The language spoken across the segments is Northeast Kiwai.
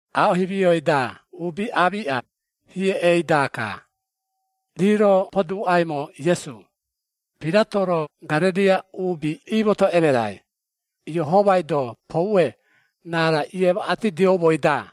Aaꞌo himioi-da uubi aamiꞌa, hieꞌei-daka, rii-ro poduuꞌaimo Iesu, Pirato-ro Garereia uubi iimoto emerai, Iehomai-do poue raarai iemaꞌatidioumoi-da.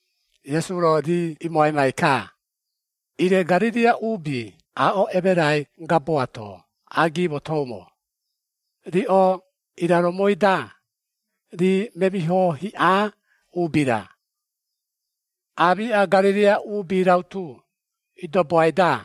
Iesu-ro rii imoaimai-ka, “Ire Garereia uubi aaꞌo emerai gaboato agimotoumo, riꞌo iraromoi-da, rii memiho hiꞌa uubi-ra, aamiꞌa Garereia uubi rautu idoboai-da?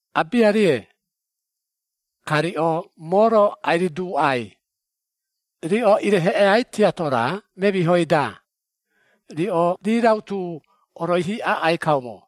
Abiarie! Ka riꞌo moo-ro ai-riduuꞌai, riꞌo ireheꞌeai tiato-ra memihoi-da, riꞌo rii rautu oroihi aꞌai kaumo.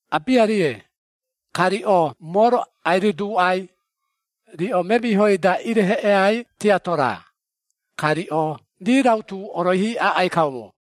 Abiarie! Ka riꞌo moo-ro ai-riduuꞌai, riꞌo memihoi-da ireheꞌeai tiato-ra, ka riꞌo rii rautu oroihi aꞌai kaumo.”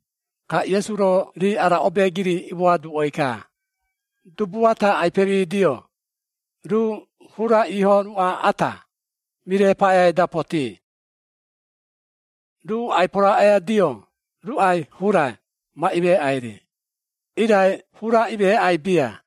Ka Iesu-ro rii ara obeegiri imoaduꞌoi-ka, “Dubu ata ai-pemidio, ruu hura iiho ruꞌa ata, mire paꞌeai-da potii. Ruu ai-poroaꞌoiadio ruꞌai hura ma imeeꞌai-ri, irai hura imeeꞌai bia.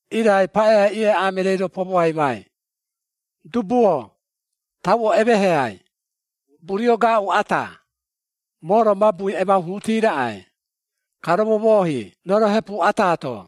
Irai paꞌeai ieaꞌaa mereei-ro pomoaimai, ‘Dubu-o, tauo emeheai, burio gaaꞌu ata, moo-ro mabui emauhuuti raꞌai, ka romomoohi roro hepu ata-to.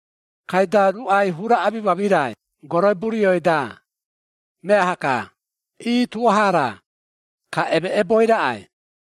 Kaida ruꞌai hura amimamirai goroi burioi-da, meaha-ka, ii tuaha-ra, ka emeꞌeboi raꞌai.’”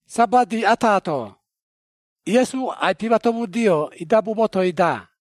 Sabati ataato, Iesu ai-pimatomudio idabu motoi-da.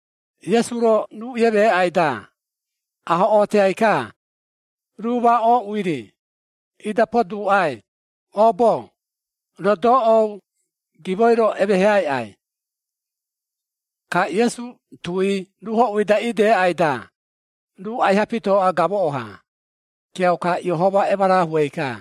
Iesu-ro ruu iemeeꞌai-da, ahoꞌootiai-ka, ruu ma ooꞌui-ri, ida poduuꞌai, “Oobo-o, roo doꞌou gimoi-ro, emeheaiꞌai.” Ka Iesu tui ruu hoꞌui-da ideꞌai-da, ruu aiha pitooꞌa gamoꞌo-ha, kiauka Iehoma emarahuei-ka.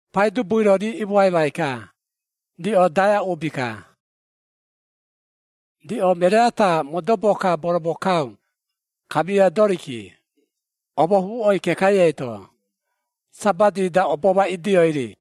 Paidubui-ro rii imoaimai-ka, “Riꞌo daea uubi-ka! Riꞌo meree ata modobo-ka boromokau, kamia doriki, omohuuꞌoi kekai eito, Sabati-da obo ma idioi-ri!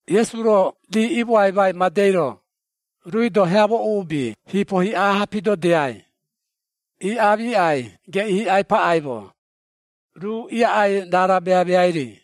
Iesu-ro rii iimoaimai madei-ro, ruui-do heamo uubi hiipo hiꞌa-ha pidodiai, ii aamiꞌai geꞌii hiꞌai paꞌaimo, ruu iaꞌai raara meameai-ri.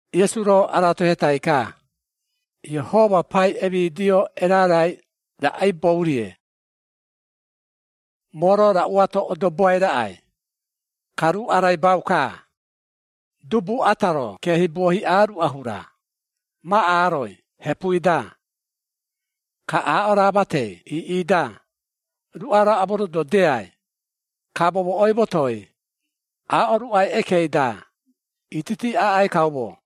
Iesu-ro aratohetai-ka, “Iehoma pai emidio erarai raꞌaibou-rie? Moo-ro raꞌu ato odoboai raꞌai? Ka ruu araibau-ka, dubu ata-ro keehibuo hiꞌa ruꞌa hura, ma aroi hepui-da, ka aaꞌo raa matei iiꞌi-da, ruꞌa-ro amorododiai, ka momoꞌoi motoi aaꞌo ruꞌai ekei-da, ititi aꞌai kaumo.”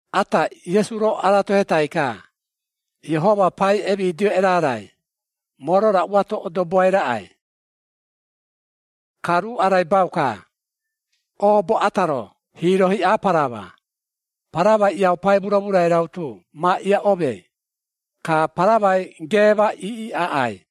Ata Iesu-ro aratohetai-ka, “Iehoma pai emidio erarai, moo-ro raꞌu ato odoboai raꞌai? Ka ruu araibau-ka, oobo ata-ro hiiro hiꞌa parama, paramai iaupai muramurai rautu ma iaꞌomei, ka paramai geema iiꞌi aꞌai.”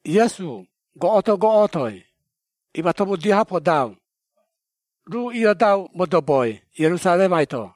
Iesu goꞌoto-goꞌotoi, imatomudio-ha podau, ruu iodau modoboi Ierusaremai-to.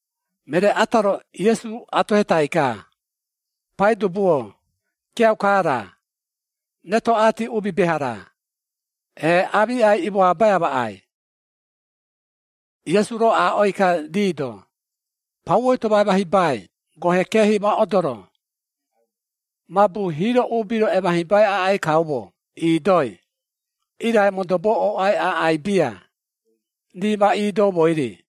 Meree ata-ro Iesu atohetai-ka, “Paidubu-o, kiauka-ra, retoꞌati uubi beha-ra, ee aamiꞌai imoabai amaꞌai?” Iesu-ro aaꞌoi-ka rii-do, “Pauoi-to ma emahibai gohe keehi ma odoro, mabu hiiro uubi-ro emahibai aꞌai kaumo iidoi, irai modobo ooꞌai aꞌai bia, rii ma iidoumoi-ri.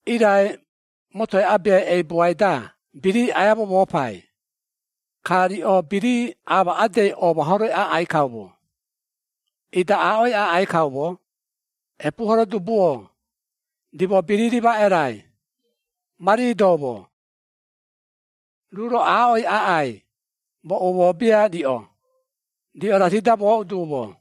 Irai, motoi abeai eibuai-da birii aia momoopai, ka riꞌo birii amaꞌedei oomahoroi aꞌai kaumo, ida aaꞌoi aꞌai kaumo, ‘Epuuhoro dubu-o, rimo birii rimaꞌerai, ma riidoumo!’ Ruu-ro aaꞌoi aꞌai, ‘Moo umoo bia riꞌo, riꞌo raati-da mooꞌu duumo.’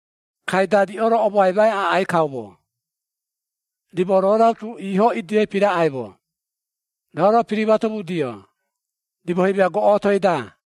Kaida riꞌo-ro omoaimai aꞌai kaumo, ‘Rimo roo rautu iiho idioi piraꞌaimo, roo-ro pirimatomudio, rimo himia goꞌotoi-da!’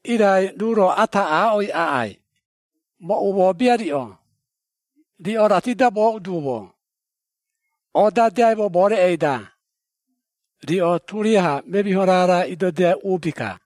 Irai ruu-ro ata aaꞌoi aꞌai, ‘Moo umoo bia riꞌo, riꞌo raati-da mooꞌu duumo, oodadeaimo moo reꞌei-da, riꞌo turiaha memiho raara idodiai uubi-ka!’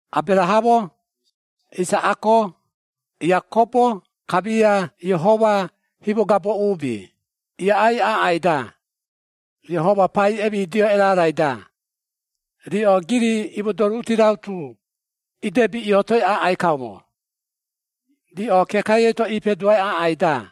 “Aberahamo, Isaꞌako, Iakobo kamia Iehoma himogabo uubi iaꞌai aꞌai-da, Iehoma pai emidio erarai-da, riꞌo giri iimodoruuti rautu idebi iootoi aꞌai kaumo, riꞌo kekai eito iipeduai aꞌai-da.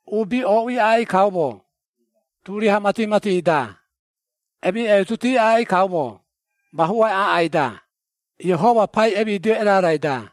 Uubi ooꞌui aꞌai kaumo turiaha mati-mati-da, emiꞌeituti aꞌai kaumo mahuai aꞌai-da, Iehoma pai emidio erarai-da.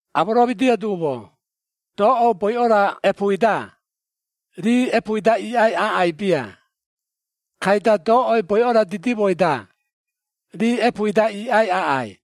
Amoromidio duumo, doꞌou boiꞌo-ra epuui-da, rii epuui-da iiꞌai aꞌai bia, kaida doꞌou boiꞌo-ra didimoi-da, rii epuui-da iiꞌai aꞌai.”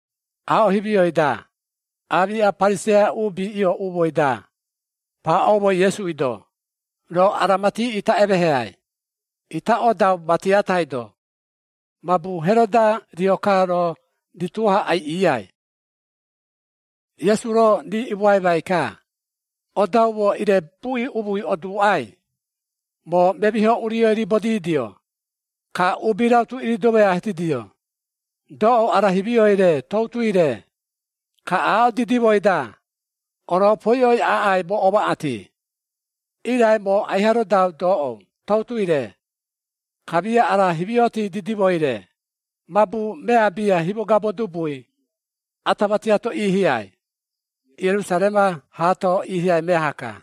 Aaꞌo himioi-da, aamiꞌa Pariseia uubi iooꞌumoi-da, paaꞌoumo Iesui-do, “Roo ara mati ita emeeheai, ita odau mati atai-to, mabu Heroda rio-ka roo rituo-ha aiꞌiiai.” Iesu-ro rii imoaimai-ka, “Odaumo ire buꞌi umui oduuꞌai, ‘Moo memiho urioi riibodidio, ka uubi rautu iridomoiatidio, doꞌou ara himioi-re toutui-re, ka aaꞌo didimoi-da, oropoiꞌoi aꞌai moo omaꞌati.’ Irai moo aiha rodau doꞌou, toutui-re, kamia ara himioti didimoi-re, mabu mea bia himogabo dubui, ata matiato iihiai, Ierusarema haato iihiai meaha-ka.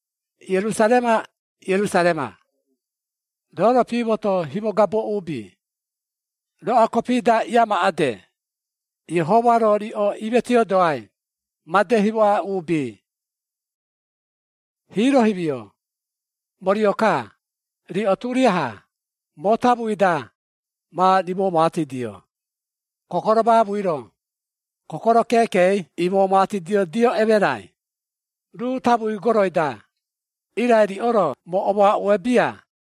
“Ierusarema! Ierusarema! Roo-ro piimoto himogabo uubi, roꞌoa kopi-da iiamaꞌede, Iehoma-ro riꞌo iimetiodoai, made himoꞌa uubi! Hiiro himio, moo rio-ka, riꞌo turiaha, moo tamui-da ma rimoꞌomaatidio, kokoro maamui-ro, kokoro keekei imoꞌomaatidiodio emerai, ruu tamui goroi-da, irai riꞌo-ro moo omoaꞌue bia!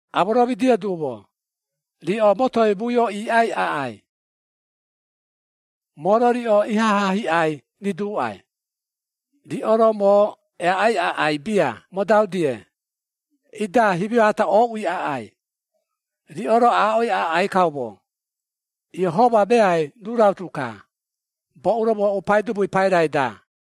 Amoromidio duumo, riꞌo motoi muio iiꞌai aꞌai. Moo-ro riꞌo ihaha hiꞌai riduuꞌai, riꞌo-ro moo eaꞌai aꞌai bia modau-die, ida himio ata ooꞌui aꞌai, riꞌo-ro aaꞌoi aꞌai kaumo, ‘Iehoma meai ruu rautu-ka, boꞌu-ro mooꞌu Paidubui pairai-da.’”